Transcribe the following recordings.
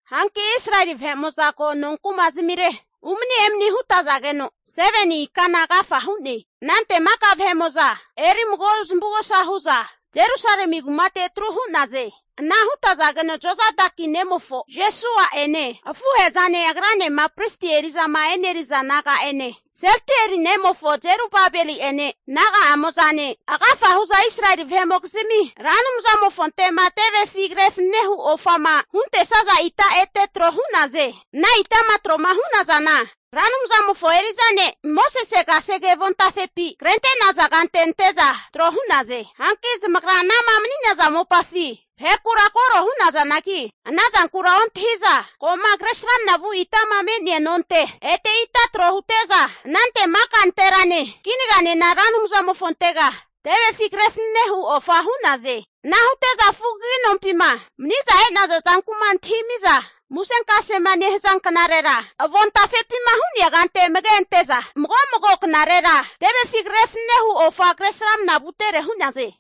Hanki Israeli vahe'mo'za ko nonkuma zamire umani emani hutage'za henka, 7ni ikana agafa hu'ne. Anante maka vahe'mo'za erimago zamavugosa hu'za Jerusalemi kumate atru hu'naze. Ana hutazageno Jozadaki nemofo Jeshua'ene afuhe'zane agranema pristi eri'zama eneriza naga'ene, Sealtieli nemofo Jerubabeli'ene naga'amozane agafa hu'za Israeli vahe'mokizmi Ra Anumzamofonte'ma tevefi kre fnanehu ofama huntesaza ita ete tro hu'naze. Ana itama tro'ma hu'nazana Ra Anumzamofo eri'za ne' Mosese kasege avontafepi krente'naza kante ante'za tro hu'naze. Hanki zamagra anama mani'naza mopafi vahekura koro hu'nazanagi, ana zankura ontahi'za ko'ma kresramna vu itama me'nea nonte ete ita tro hute'za, anante maka nanterane kinaganena Ra Anumzamofontega tevefi kre fanane hu ofa hu'naze. Ana hute'za Fugagi Nompima mani'za e'naza zanku'ma antahimiza musenkasema nehaza knarera, avontafepima hu'nea kante amage ante'za, mago mago knarerera tevefi kre fanane hu ofa kre srama vutere hu'naze.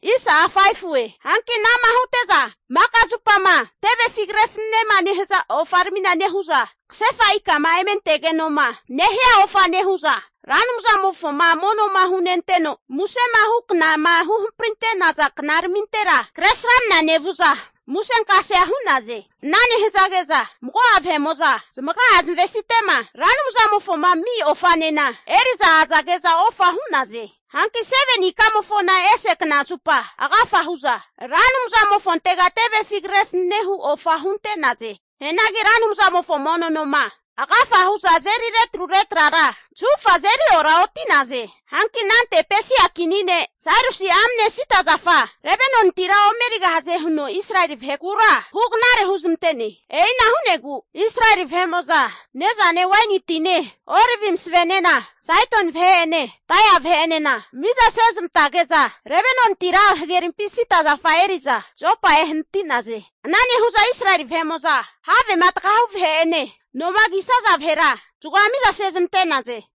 Hanki anama hute'za maka zupama tevefi kre fananema nehaza ofaramina nehu'za, kasefa ikama eme antegeno'ma nehia ofa nehu'za, Ra Anumzamofoma mono'ma hunenteno musema hu knama huhamparinte'naza knaramintera kresramna nevu'za musenkasea hu'naze. Ana nehazage'za mago'a vahe'mo'za, zamagra'a zamavesite'ma Ra Anumzamofoma ami ofanena eri'za azage'za ofa hu'naze. Hanki 7ni ikamofona ese knazupa agafa hu'za, Ra Anumzamofontega tevefi kre fanane hu ofa hunte'naze. Hianagi Ra Anumzamofo mono noma agafa hu'za azeri retrure trara zahufa azeri oraoti'naze. Hanki anante Pesia kini ne' Sairusi'a amne sida zafa Lebanonitira ome erigahaze huno Israeli vahekura hu knare huzmante'ne. E'ina hu'negu Israeli vahe'mo'za ne'zane waini tine olivi masavenena Saidoni vahe'ene Tairi vahe'enena miza sezmantazage'za Lebanonitira hagerimpi sida zafa eri'za Jopa ehanati'naze. Ana nehu'za Israeli vahe'mo'zama havema tagahu vahe'ene noma kisaza vahera zagoa miza sezmante'naze.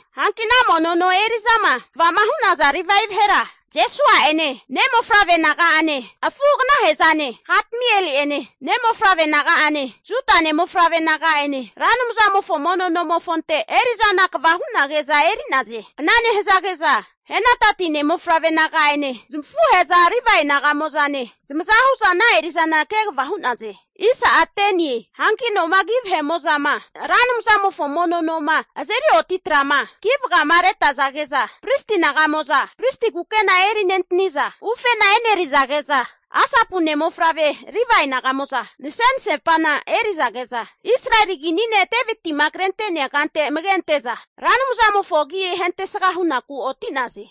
Hanki ana mono no eri'zama kvama hu'naza Livae vahera, Jeshua'ene ne' mofavre naga'ane afu'aganahe'zane, Kadmieli'ene ne' mofavre naga'ane Juda ne' mofavre naga'ene, Ra Anumzamofo mono nomofonte eri'zana kva hu'nage'za eri'naze. Ana nehazage'za Henadadi ne' mofavre naga'ene zamafuhe'za Livae naga'mo'zane zamaza hu'za ana eri'zana kegava hu'naze. Hanki nomagi vahe'mo'zama Ra Anumzamofo mono noma azeri oti tra'ma ki vagamaretazage'za, pristi naga'moza pristi kukena eri nentani'za, ufena enerizage'za, Asapu ne' mofavre Livae naga'mo'za nase'nasepa eri'zage'za, Israeli kini ne' Deviti'ma krente'nea kante amage ante'za Ra Anumzamofo agi ahentesga hunaku oti'naze.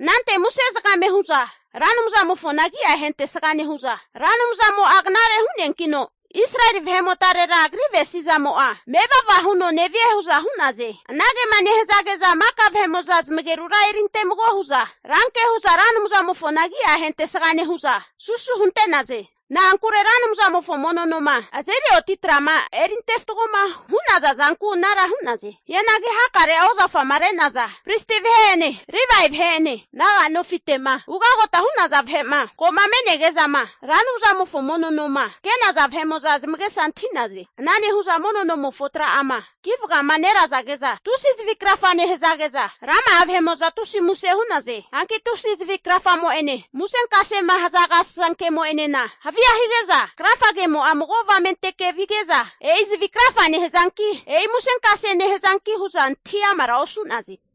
Anante muse zagame hu'za Ra Anumzamofona agi'a ahentesga nehu'za, Ra Anumzamo'a knare hu'neankino Israeli vahe'motarera Agri avesizamo'a mevava huno nevie hu'za hu'naze. Anagema nehazage'za maka vahe'mo'za zamagerura erinte mago hu'za, ranke hu'za Ra Anumzamofona agia ahentesga nehu'za, susu hunte'naze. Na'ankure Ra Anumzamofo mono noma azeri oti tra'ma erinte fatgoma hu'naza zanku anara hu'naze. Hianagi hakare'a ozafama re'naza pristi vahe'ene Livae vahe'ene naga nofite'ma ugotama hu'naza vahe'ma, ko'ma me'nege'zama Ra Anumzamofo mono noma ke'naza vahe'mo'za zamagesa antahi'naze. Ana nehu'za mono nomofo tra'ama ki vagama nerazage'za tusi zavi krafa nehazage'za, rama'a vahe'mo'za tusi muse hu'naze. Hanki tusia zavi krafagemo'ene musenkasema haza agasasankemo'enena havia higeno krafamo'a mago avamenteke vige'za, e'i zavi krafa nehazanki, e'i musenkase nehazanki hu'za antahi amara osu'naze.